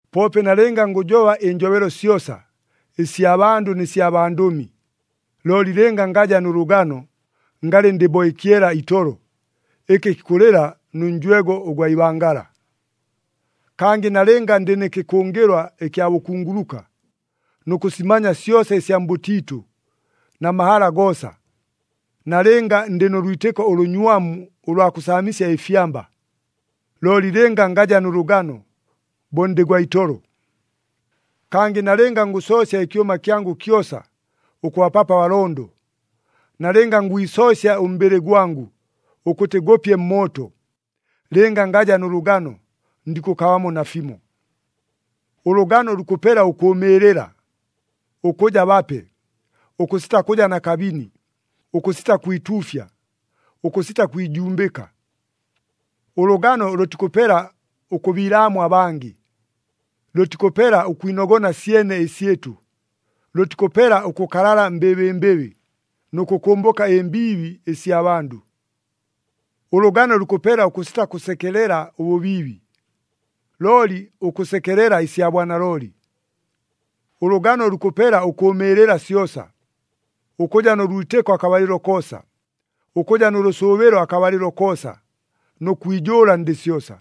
Poope nalɨnga ngʉjoba ɨnjobelo syosa, ɨsya bandʉ nɨ sya bandʉmi, looli lɨnga ngaja nʉ lʉgano, ngalɨ ndɨ bo ɨkyela itolo, ɨkɨ kikʉlɨla, nʉ njwego ʉgwa ibangala. Kangɨ nalɨnga ndɨ nɨ kɨkʉngɨlwa ɨkya bʉkunguluka, nʉ kʉsimanya syosa ɨsya mbʉtiitʉ, na mahala goosa, nalɨnga ndɨ nʉ lwitɨko ʉlʉnywamu ʉlwa kʉsaamisya ɨfyamba, looli lɨnga ngaja nʉ lʉgano, bo ndɨ gwa itolo. Kangɨ nalɨnga ngʉsoosya ɨkyʉma kyangʉ kyosa, ʉkʉbapapo abalondo, nalɨnga ngwisoosya ʉmbɨlɨ gwangʉ, ʉkʉtɨ gʉpye mmooto, lɨnga ngaja nʉ lʉgano, ndikʉkabamo nafimo. Ʉlʉgano lukʉpela ʉkʉʉmɨɨlɨla, ʉkʉja bape, ʉkʉsita kʉja na kabini, ʉkʉsita kwituufya, ʉkʉsita kwijumbɨka. Ʉlʉgano lʉtikʉpela ʉkʉbiilaamwa abangɨ, lʉtikʉpela ʉkwinogona syene ɨsyɨtʉ, lʉtikʉpela ʉkʉkalala mbɨbɨmbɨbɨ, nʉ kʉkʉmbʉka ɨmbiibi ɨsya bandʉ. Ʉlʉgano lukʉpela ʉkʉsita kʉsekelela ʉbʉbiibi, looli ʉkʉsekelela ɨsya bwanalooli. Ʉlʉgano lukʉpela ʉkʉʉmɨɨlɨla syosa, ʉkʉja nʉ lwitɨko akabalɨlo koosa, ʉkʉja nʉ lʉsʉʉbɨlo akabalɨlo koosa, nʉ kwijʉʉla ndɨ syosa.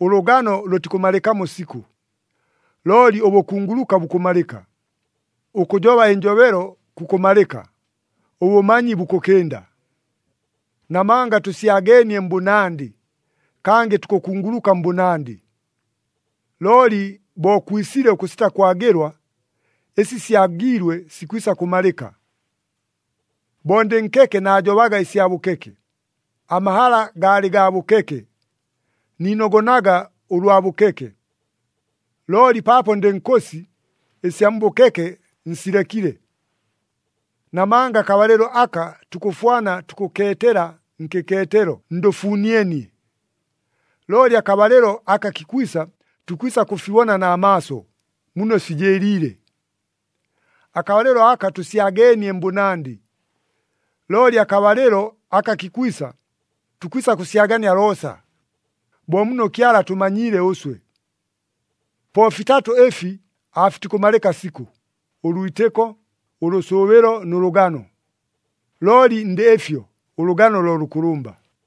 Ʉlʉgano lʉtikʉmalɨkamo sikʉ. Looli ʉbʉkunguluka bukʉmalɨka, ʉkʉjoba ɨnjobelo kukʉmalɨka, ʉbʉmanyi bukʉkɨnda. Namanga tʉsyageenie mbʉnandɨ, kangɨ tukʉkunguluka mbʉnandɨ. Looli bo kwisile ʉkʉsita kwagɨlwa, ɨsi syagiilwe sikwisa kʉmalɨka. Bo ndɨ nkeke naajobaga ɨsya bʉkeke, amahala gaalɨ gaa bʉkeke, niinogonaga ʉlwa bʉkeke. Looli paapo ndɨ nkʉsi, ɨsya mbʉkeke nsilekile. Namanga akabalɨlo aka tukʉfwana tukʉkeetela nkɨkeetelo ndʉfunienie, looli akabalɨlo aka kikwisa tukwisa kʉfibona na maaso muno fijɨɨliile. Akabalɨlo aka tʉsyageenie mbʉnandɨ. Looli akabalɨlo aka kikwisa, tukwisa kʉsyagania loosa, bo muno Kyala atʉmanyiile ʉswe. Po fitatʉ ɨfi aafitikʉmalɨka sikʉ, ʉlwitɨko, ʉlʉsʉʉbɨlo nʉ lʉgano. Looli ndɨ ɨfyo, ʉlʉgano lo lʉkʉlʉmba.